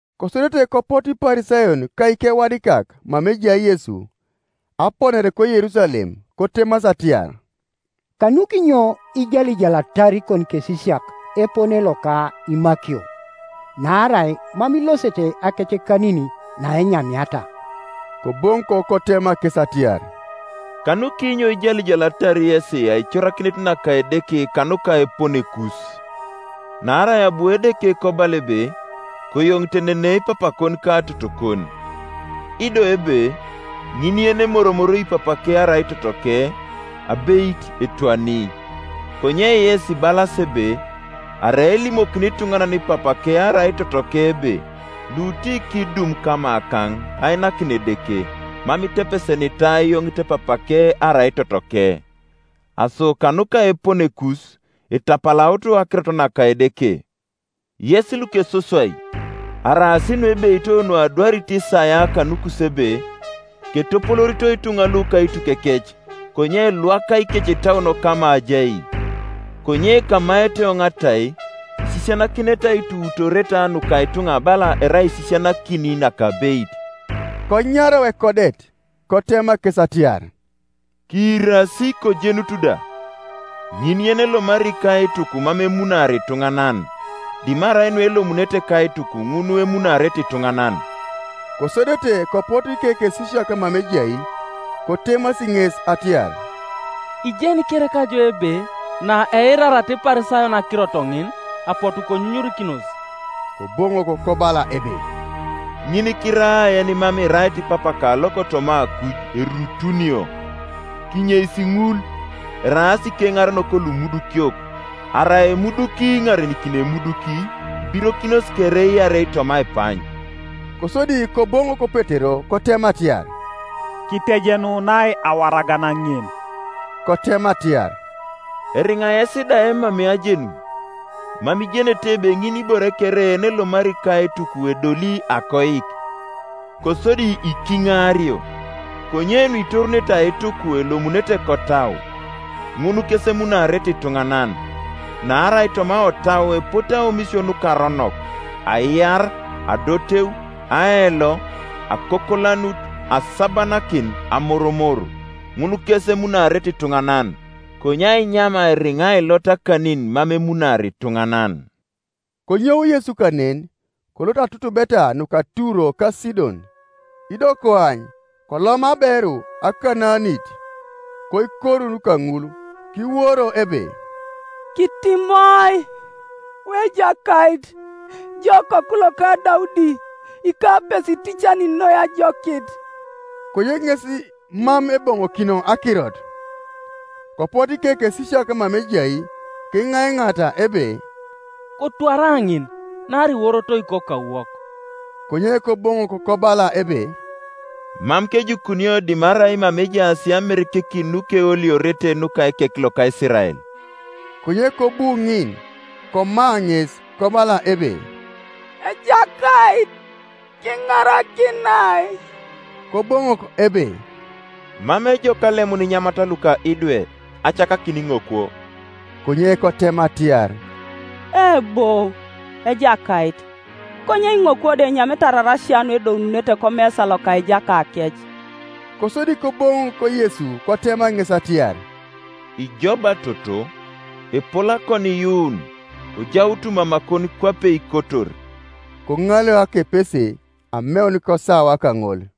Kosodete kopotu Iparisayon ka ikewadikak mama ejai Yesu aponare koYerusalem, kotemasi atiar, “Kanukinyo ijalijalatar ikonikesisiak epone loka imakio? Naarai mam ilosete akecekanin naenyamiata.” Koboŋok kotema kes atiar, “Kanukinyo ijalijalatar yesi aicorakinet naka Edeke kanuka eponekus? Naarai abu Edeke kobala ebe, ‘Koyoŋitenene papakon ka totokon,’ ido ebe, ‘Ŋin yenimoromoroi papake arai totoke, abeit etwani.’ Konye yes ibalasi ebe, Arai elimokini ituŋanan papake arai totoke ebe, Lutikidum kamakaŋ ainakin Edeke, mam itepesenitai ayoŋit papake arai totoke. Aso kanuka eponekus, itapalaut akirot naka Edeke. Yes lukesoswai! Araas nuebeito nuadwarit Isaia kanukus, ebe: ‘Ketopoloorito ituŋa lu kaitukekec, Konye elwaka ikecetauon kama ajai; Konye kamaete eoŋ atai, Isisianakinete aituutooreta nuka ituŋa bala erai aisisianakin nakabeit.’” Konyarau ekodet kotema kes atiar, “Kiirasi kojenutu da: ŋin yenelomari kaituk mam emunaari ituŋanan, dimarai nuelomunete kaituk, ŋun emunaarete ituŋanan.” Kosodete kopotu ikekesisiak mama ejai, kotemasi ŋes atiar, “Ijeni kereka ijo ebe naeirariata Iparisayon akirot ŋin, apotu konyunyurikinos?” Koboŋok kobala ebe, “Ŋinikiraa yenimam irait Papaka lokotoma akuj erutunio. Kinyeis ŋul; eraas ikeŋarenok lumudukiok, Arai emuduki iŋarenikini emuduki, ibirokinos kere iarei toma aipany.” Kosodi Koboŋok Petero kotema atiar, “Kitejenunai awaragan ŋin.” Kotema atiar, “Eriŋa yes da emamei ajenun? Mam ijenete ebe ŋinibore kere yenelomari kaituk edoli akoik, kosodi ikiŋaario? Konye nuitorunete aituk elomunete kotau, ŋun kes emunaarete ituŋanan. Naarai toma otau epote aomisio nukaronok, aiar, adoteu, aelo, akokolanut, asabanakin, amoromor, Ŋun kes emunaarete ituŋanan; konye ainyam eriŋa ilota akanin mam emunaari ituŋanan.” Konyou Yesu kanen, kolot atutubeta nuka Turo ka Sidon. Ido koany, kolom aberu Akanaanit koikorun kaŋul, kiworo ebe, “Kitimoi, wu Ejakait, ijo okoku loka Daudi; ikapese iticani noi ajokit.” Konye ŋes mam eboŋokino akirot, Kopotu ikekesisiak mama ejai kiŋaiŋaata ebe, “Kotwara ŋin; naarai iworotoi kokauwok.” Konye Koboŋok kobala ebe, “Mam kejukunio dimarai mama ejaas amerekekin nukeoliorete nuka ekek loka Isirael.” Konye kobu ŋin, koma ŋes, kobala ebe, “Ejakait, kiŋarakinai.” Koboŋok ebe, “Mam ejok alemun inyamat luka idwe, acakakin iŋokwo.” Konye kotema atiar, “Eebo, Ejakait; konye iŋokwo da enyamete ararasia nuedoununete komesa loka ijakakec.” Kosodi koboŋok Yesu kotema ŋes atiar, “Ijo ba toto, epol akoniiyuun; kojaut mamakon kwape ikotor.” Koŋaleu akepese ameun kosawa kaŋol.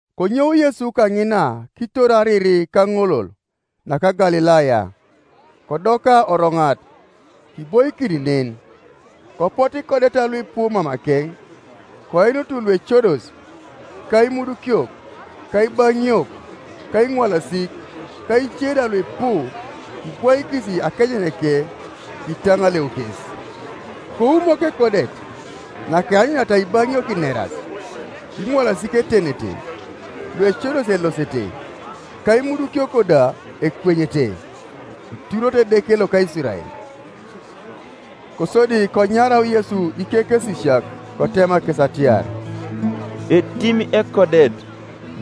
Konyou Yesu kaŋina kitor ariri kaŋolol naka Galilaya, kodoka oroŋat, kiboikin nen. Kopotu ikodeta luipu mamakeŋ, koinut luecodos, ka imudukiok, ka ibaŋiok, ka iŋwalasik, ka ice da luipu, kibwaikis akejeneke; kitaŋaleu kes. Koumok ekodet, nakeanyuniata ibaŋiok ineras, iŋwalasik etenete, luecodos elosete, ka imudukiok da ekwenyete; kituroto Edeke loka Isirael. Kosodi konyarau Yesu ikekesisiak kotema kes atiar, “Etim ekodet,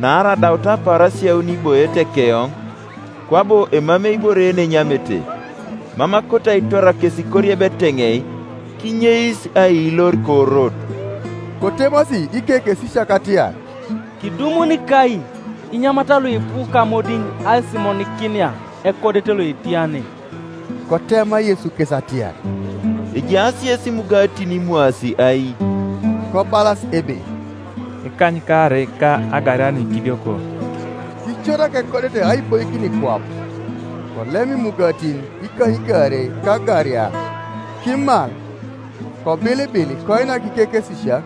naarai adaut apaarasia auni iboiete keoŋ, kwabo emamei ibore yenenyamete; mam akoto aitwar kes koriebi eteŋei, kinyeis aiilor korot.” Kotemasi ikekesisiak atiar, “Kidumuni kai inyamat luipu kamodiŋ aisimonikinia ekodet loetia ne?” Kotema Yesu kes atiar, “Ejaas yes imugatin imwaasi ai?” Kobalas ebe, “Ikanykaarei, ka agaria nuikidioko.” Kicorak ekodet aiboikin kwap, Kolem imugatin ikanykaarei ka agaria, kimal, kobilibil koinak ikekesisiak,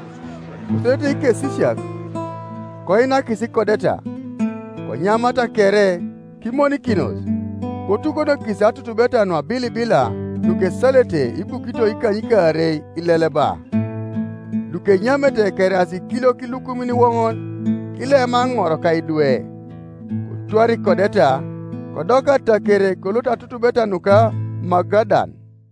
kosodete ikesisiak koinakis ikodeta. Konyamata kere, kimonikinos; kotukonokis atutubeta nuabilibila nukesalete ibukito ikanykaarei ileleba. Lukenyamete keraas ikiliok ilukumin iwoŋon, kilema aŋor ka idwe, Kotwara ikodeta, kodoka ataker kolot atutubeta nuka Magadan.